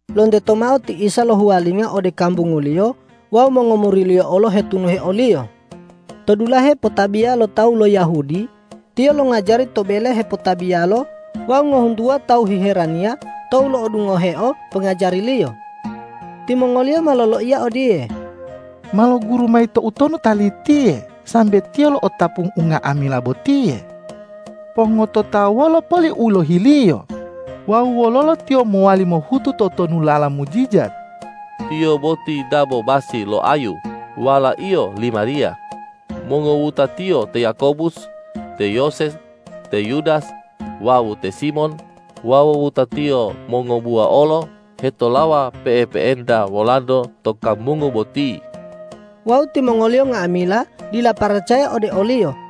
Lonteto mao ti Isa lohuwalinga ode kambungu-Liyo wawu mongomuri-Liyo olo hetunuhe o-Liyo. To dulahe hepotabiya lo tawu lo Yahudi Tiyo longajari to bele hepotabiyalo wawu ngohuntuwa tawu hiheraniya tou lo'odungoheo pongajari-Liyo. Timongoliyo ma loloiya odiye,”Ma lo guru mayi toutonu Talitiye sambe Tiyo lo'otapu unga'amila botiye? Pongotota wolo poli u yilohiliyo? Wawu wololo Tiyo mowali mohutu totonulala mujijat? Tiyo boti dabo basi lo ayu, walaiyo li Mariya, mongowuta-Tiyo te Yakobus, te Yoses, te Yudas wawu te Simon wawu wuta-Tiyo mongobuwa olo hetolawa pe'epe'enta wolanto to kambungu boti.” Wawu timongoliyo nga'amila dila paracaya ode o-Liyo.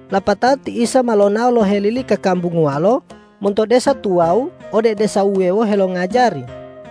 Lapatao ti Isa ma lonao lohelili kakambunguwalo monto desa tuwawu ode desa wuwewo helongajari.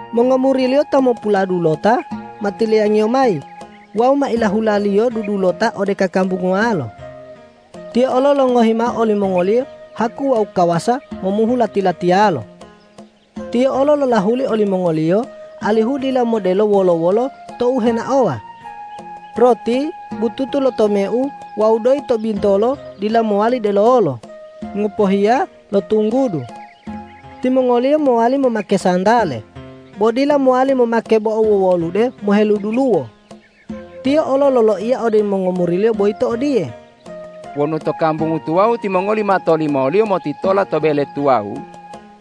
Mongomuri-Liyo ta mopuladulota ma tiliyangiyo mayi wawu ma ilahula-Liyo dudulota ode kakambunguwalo. Tiyo olo longohi mao olimongoliyo haku wawu kawasa momuhu lati-latiyalo. Tiyo olo lolahuli olimongoliyo alihu dila modelo wolo-wolo tou henaowa. Roti, bututu lo tomeu wawu doyi to bintolo dila mowali delolo, ngopohiya lo tunggudu. Timongoliyo mowali momake santale, bo dila mowali momake bo'o wowolude moheluduluwo. Tiyo olo loloiya ode mongomuri-Liyo boyito odiye,”Wonu to kambungu tuwawu timongoli ma tolimoliyo motitola to bele tuwawu,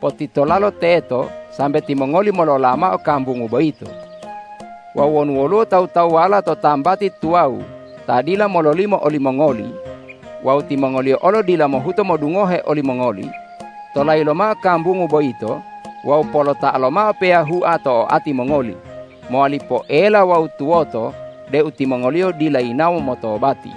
potitolalo teto sambe timongoli molola mao kambungu boyito. Wawu wonu woluwo tawu-tawuwala to tambati tuwawu ta dila mololimo olimongoli wawu timongoliyo olo dila mohuto modungohe olimongoli, tolayi lomao kambungu boyito wawu polota'a lomao peyahua to oati mongoli mowali poela wawu tuwoto deu timongoliyo dila yinawo motobati.”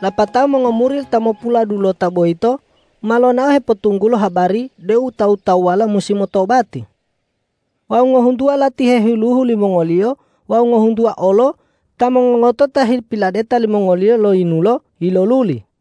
Lapatao mongomuri ta mopuladulota boyito ma lonao helopotunggulo habari deu tawu-tawuwalo musi motobati. Wawu ngohuntuwa lati hehiluhu limongoliyo wawu ngohuntuwa olo ta mongongoto ta hepiladeta limongoliyo lo yinulo yiloluli.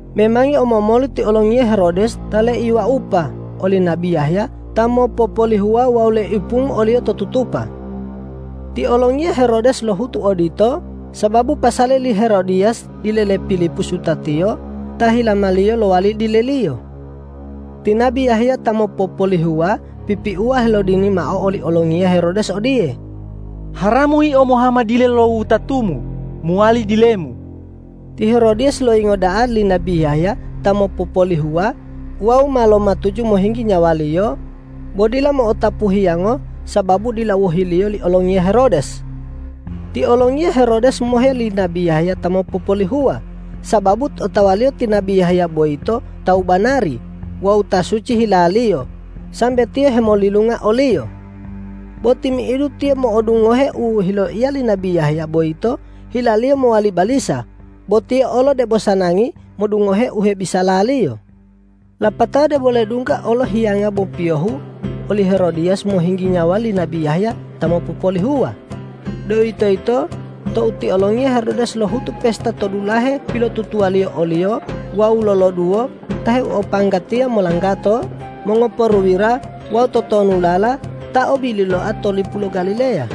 Memangi omo-omolu ti olongiya Herodes ta loiwaupa oli nabi Yahya ta mopopolihuwa wawu loipungu oliyo to tutupa. Ti olongiya Herodes lohutu odito sababu pasali li Herodiyas dile le Pilipus wutatiyo, ta hilamaliyo lowali dileliyo. Ti nabi Yahya ta mopopolihuwa pipiuwa helodini mao oli olongiya Herodes odiye,”Haramu yio mohama dile lo wutatumu mowali dilemu.” Ti Herodiyas loyingo da'a li nabi Yahya ta mopopolihuwa wawu ma lomatuju mohinggi nyawaliyo, bo dila mo'otapu hiyango sababu dila wohiliyo li olongiya Herodes. Ti olongiya Herodes mohe li nabi Yahya ta mopopolihuwa, sababu otawaliyo ti nabi Yahya boyito tawu banari wawu ta suci hilaliyo, sambe tiyo hemolilunga oliyo. Bo timi'idu tiyo mo'odungohe u heloiya li nabi Yahya boyito hilaliyo mowali balisa, bo tiyo olo debo sanangi modungohe u hebisalaliyo. Lapatao debo ledungga olo hiyanga mopiyohu oli Herodiyas mohinggi nyawa li nabi Yahya ta mopopolihuwa, deuwitoyito tou ti olongiya Herodes lohutu pesta to dulahe pilotutuwaliyo oliyo wawu loloduwo ta heopanggatiya molanggato, mongoporowira wawu totonulala ta o biluloa to lipu lo Galileya.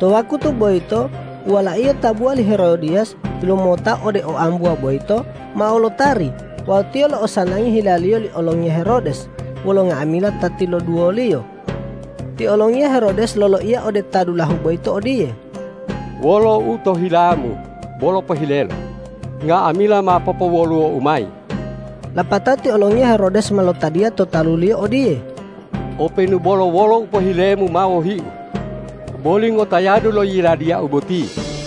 To wakutu boyito walaiyo tabuwa li Herodiyas tilumuwotao ode oambuwa boyito mao lotari wawu tiyo lo'osanangi hilaliyo li olongiya Herodes wolo nga'amila ta tiloduwoliyo. Ti olongiya Herodes loloiya ode ta dulahu boyito odiye,”Wolo u otohilamu bolo pohilelo, nga'amila ma popowoluwou mayi!” Lapatao ti olongiya Herodes ma lotadiya to taluliyo odiye,”Openu boli wolo u pohilemu ma wohiu, boli ngotayadu lo yiladiyau boti!”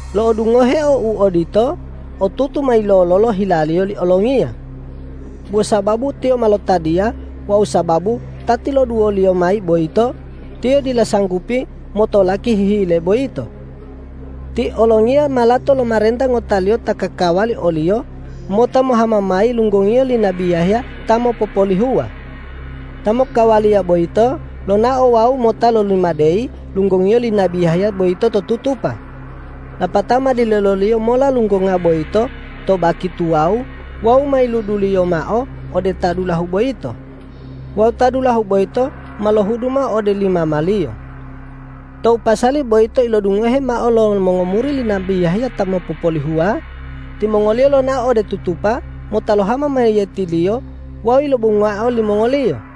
Lo'odungoheo u odito, otutu ma yilololo hilaliyo li olongiya. Bo sababu tiyo ma lotadiya wawu sababu ta tiloduwoliyo mayi boyito, tiyo dila sanggupi motolaki hihile boyito. Ti olongiya ma lato lomarenta ngotaliyo ta kakawali oliyo mota mohama mayi lunggongiyo li nabi Yahya ta mopopolihuwa. Ta mokkawaliya boyito lonao wawu mota lolimadeyi lunggongiyo li nabi Yahya boyito to tutupa. Lapatao ma dileloliyo mola lunggonga boyito to baki tuwawu wawu ma yiluduliyo mao ode ta dulahu boyito. Wawu ta dulahu boyito ma lohudu mao ode oli mamaliyo. Tou pasali boyito ilodungohe mao lo mongomuri li nabi Yahya ta mopopolihuwa, timongoliyo lonao ode tutupa mota lohama mayiyetiliyo wawu yilobungao limongoliyo.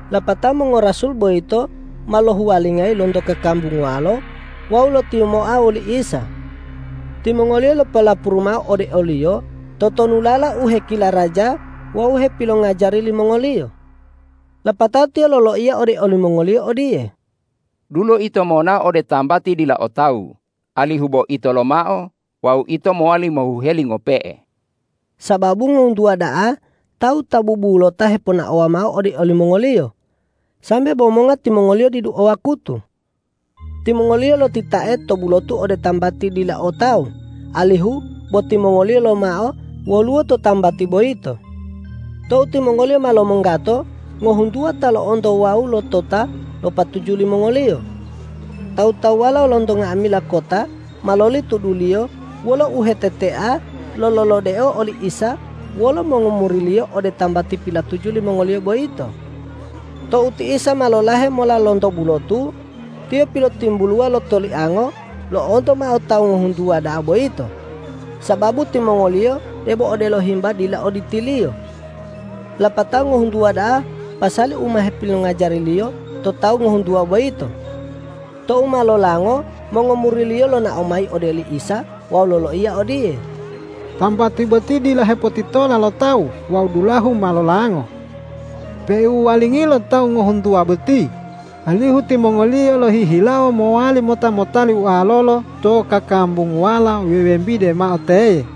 Lapatao mongorasul boyito ma lohuwalingayi lonto kakambunguwalo wawu lotiyimoa woli Isa. Timongoliyo lopolapuru mao ode o-Liyo totonulala u hekilaraja wawu hepilongajari limongoliyo. Lapatao Tiyo loloiya ode olimongoliyo odiye,”Dulo ito monao ode tambati dila o tawu, alihu bo ito lomao wawu ito mowali mohuheli ngope'e!” Sababu ngohuntuwa da'a tawu ta bubulota heponaowa mao ode olimongoliyo, sambe bo monga timongoliyo didu o wakutu. Timongoliyo lotitae to bulotu ode tambati dila o tawu, alihu bo timongoliyo lomao ta woluwo to tambati boyito. Tou timongoliyo ma lomonggato, ngohuntuwa ta lo'onto wawu lotota lo patuju limongoliyo. Tawu-tawuwala lonto nga'amila kota ma loli tuduliyo wolo uhetetea lo lolodeo oli Isa wolo mongomuri-Liyo ode tambati pilatuju limongoliyo boyito. Tou ti Isa ma lolahe mola lonto bulotu, Tiyo pilotimbuluwa lo toliango lo'onto mao tawu ngohuntuwa da'a boyito, sababu timongoliyo debo odelo himba dila o ditiliyo. Lapatao ngohuntuwa da'a pasali u ma hepilongajari-Liyo to tawu ngohuntuwa boyito. Tou ma lolango mongomuri-Liyo lonao mayi ode li Isa wawu loloiya odiye,”Tambati boti dila hepotitola lo tawu wawu dulahu ma lolango. Peiwuwalingilo tawu ngohuntuwa boti, alihu timongoliyo lohihilawo mowali mota motali ualolo to kakambunguwala wewembide mao teye.”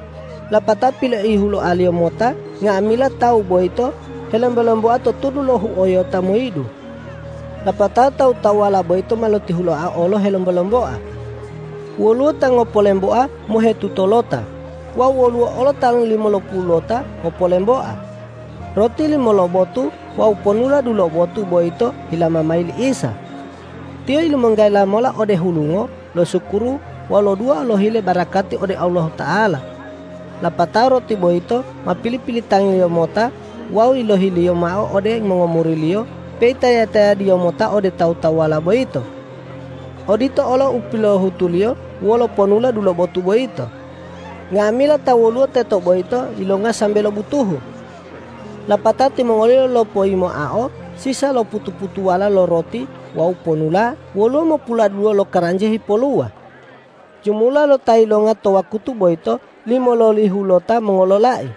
Lapatao piloihuloa-Liyo mota nga'amila tawu boyito helembo- lemboa to tudu lo huoyota moyidu. Lapatao tawu-tawuwala boyito ma lotihuloa olo helembo-lemboa. Woluwo ta ngopolemboa mohetutolota wawu woluwo olo ta limolopulota ngopolemboa. Roti limo lobotu wawu ponula dulobotu boyito hilama mayi li Isa. Tiyo yilumanggela mola ode hulungo losukuru wawu lodua lohile barakati ode Allahuta'ala. Lapatao roti boyito ma pili-pilitangiyo mota wawu yilohi-Liyo mao ode mongomuri-Liyo pei taya-tayadiyo mota ode tawu-tawuwala boyito. Odito olo u pilohutu-Liyo wolo ponula dulobotu boyito. Nga'amila ta woluwo teto boyito yilonga sambe lobutuhu. Lapatao timongoliyo lopoyimoao sisa lo putu-putuwala lo roti wawu ponula, woluwo mopuladuluwo lokaranji hipoluwa. Jumula lo ta yilonga to wakutu boyito limololihulota mongololai.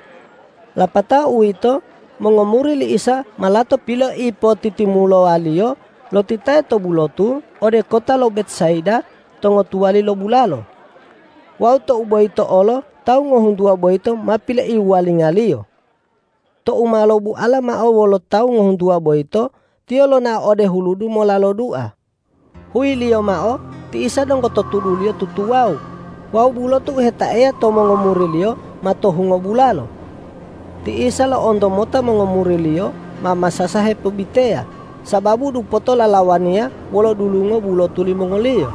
Lapatao uwito, mongomuri li Isa ma lato piloipotitimulowa-Liyo lotitae to bulotu ode kota lo Betsaida to ngotuwali lo bulalo. Wawu tou boyito olo tawu ngohuntuwa boyito ma pileiwuwalinga-Liyo. Tou ma lobuala mao wolo tawu ngohuntuwa boyito, Tiyo lonao ode huludu mola lodua. Huyiliyo mao ti Isa donggo to tuduliyo tutuwawu wawu bulotu u hetaeya to mongomuri-Liyo ma to hungo bulalo. Ti Isa lo'onto mota mongomuri-Liyo ma masasa hipobiteya, sababu dupoto lalawaniya wolo dulungo bulotu limongoliyo.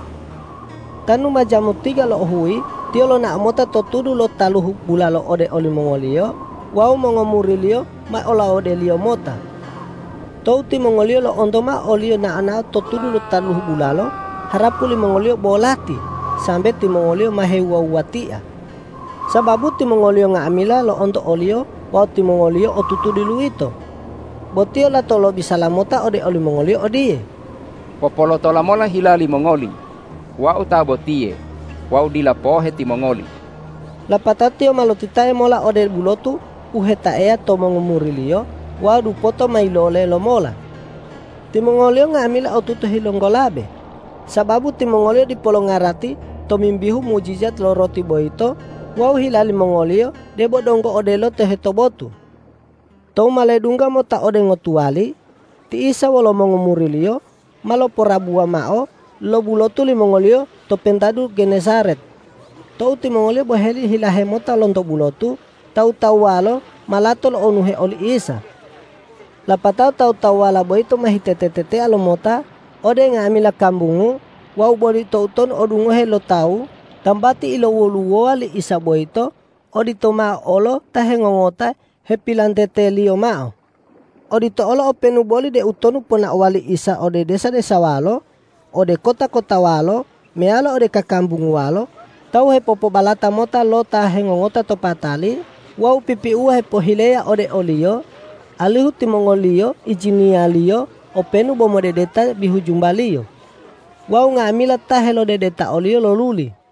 Tanu ma jamu tiga louhuyi Tiyo lonao mota to tudu lo taluhu bulalo ode olimongoliyo wawu mongomuri-Liyo ma olawode-Liyo mota. Tou timongoliyo lo'onto mao o-Liyo nao-nao to tudu lo taluhu bulalo, harapu limongoliyo bo lati, sambe timongoliyo ma hewuwa-wuwatia, sababu timongoliyo nga'amila lo'onto o-Liyo wawu timongoliyo otutu diluyito. Bo Tiyo lato lobisala mota ode olimongoliyo odiye,”Popolotola mola hila limongoli, Wau ta botiye wawu dila pohe timongoli!” Lapatao Tiyo ma lotitae mola ode bulotu u hetaeya to mongomuri-Liyo wawu dupoto ma yilole lomola. Timongoliyo nga'amila otutu hilinggolabe, sababu timongoliyo dipo longarati tomimbihu mujijat lo roti boyito wawu hila limongoliyo debo donggo odelo toheto botu. Tou ma ledungga mota ode ngotuwali, ti Isa wolo mongomuri- Liyo ma loporabuwa mao lo bulotu limongoliyo to pentadu Genesaret. Tou timongoliyo boheli hilahe mota lonto bulotu, tawu-tawuwalo ma lato lo'onuhe oli Isa. Lapatao tawu-tawuwala boyito ma hitete-tetea lomota ode nga'amila kambungu wawu boli toutonu odungohe lo tawu tambati ilowoluwowa li Isa boyito oditomao olo ta hengongota hepilanteteliyo mao. Odito olo openu boli deutonu ponaowa li Isa ode desa-desawalo, ode kota-kotawalo meyalo ode kakambunguwalo, tawu hepopobalata mota lo ta hengongota to patali wawu pipiuwa hepohileya ode o-Liyo, alihu timongoliyo ijiniya-Liyo openu bo modedeta bihu jumba-Liyo. Wawu nga'amila ta helodedeta o-Liyo loluli.